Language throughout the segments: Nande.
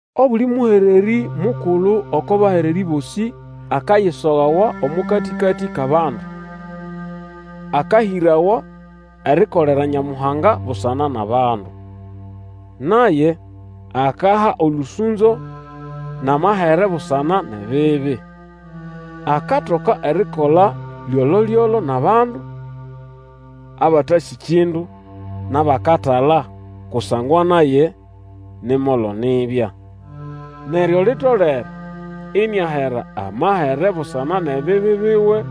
Obuli mũhererĩ mukulu oko bahererĩ bosĩ akayisogawa omo katĩkatĩ kʼabandu, akahĩrawa erikolera Nyamuhanga busana nʼabandu. Naye akaha olũsũnzo nʼamahere busana nʼebibi. Akatoka erikola lyolo-lyolo nʼabandu abatasĩ kindu nʼabakatala, kusangwa naye ni molo nibya. Neryo litolere iniahera amahere busana nʼebibi biwe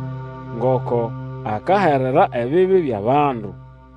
ngoko akaherera ebibi byʼabandu.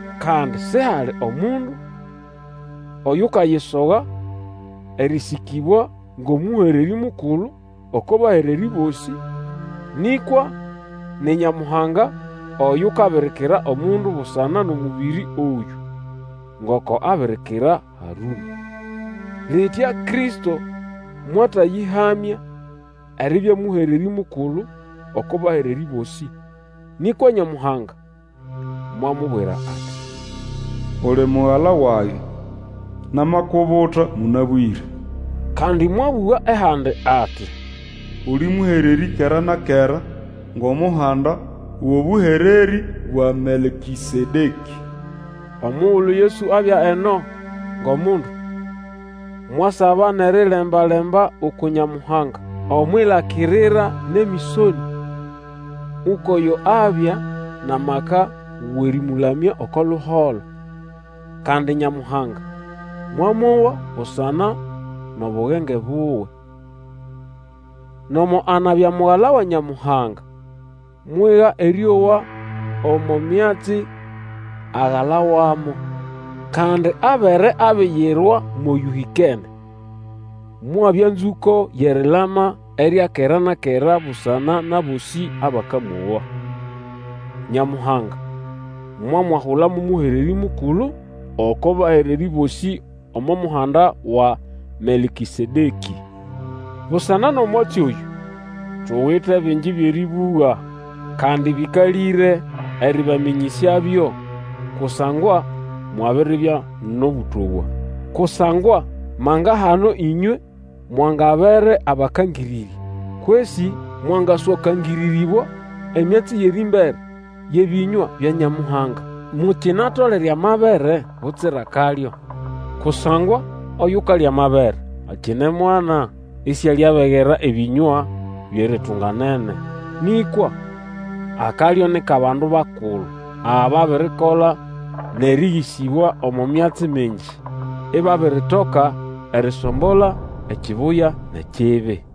Kandi sihali omundu oyukayisoga erĩsĩkĩbwa ngʼomũhererĩ mukulu oko bahererĩ bosĩ, nĩkwa ni Nyamuhanga oyukabirikira omundu busana nʼomũbĩrĩ oyũ, ngoko abirikira Harũnĩ. Litya Kristo mwatayĩhamya eribya mũhererĩ mukulu oko bahererĩ bosĩ, nĩkwa Nyamuhanga mwamubwira ati, Uli Mugala wage, Namakubuta mũnabwĩre. Kandi mwabũga ehandi ati, Uli mũhererĩ kera na kera Ngʼomuhanda wʼobũhererĩ bwa Melkĩsedekĩ. Omugulu Yesu abya eno ngʼomundu, mwasaba nʼeriremba-lemba uku Nyamuhanga, omwʼilakirira nʼemĩsonĩa, ukwʼoyo abya nʼamaka wʼerĩmũlamya oko luholo, kandi Nyamuhanga mwamowa busana nʼobugenge buwe. Nomo anabya Mugala wa Nyamuhanga, mwiga erĩowa omo myatsi agalawamo. Kandi abere abiyirwa mʼoyũhĩkene, mwabya nzũko yʼerilama erya kera na kera busana nʼabosĩ abakamowa. Nyamuhanga mwamwahula mo mũhererĩ mukulu oko bahererĩ bosĩ omo muhanda wa Melkĩsedekĩ. Busana nʼomwatsi oyũ tuwite bingi byʼerĩbũga, kandi bĩkalĩre erĩbamĩnyĩsyabyo, kusangwa mwabiribya nʼobũtowa. Kusangwa manga-hano ĩnywe mwangabere abakangĩrĩrya, kwesĩ mwangaswakangĩrĩrĩbwa emyatsi yʼerĩmbere yʼebĩnywa bya Nyamuhanga. Mukinatolere amabere butsira akalyo. Kusangwa oyukalya amabere akine mwana, isialiabegera ebĩnywa byʼeritunganene. Nĩkwa akalyo ni kʼabandu bakulu, ababirikola nʼerĩgĩsĩbwa omo myatsi mingi, ibabiritoka erisombola ekibuya nʼekibi.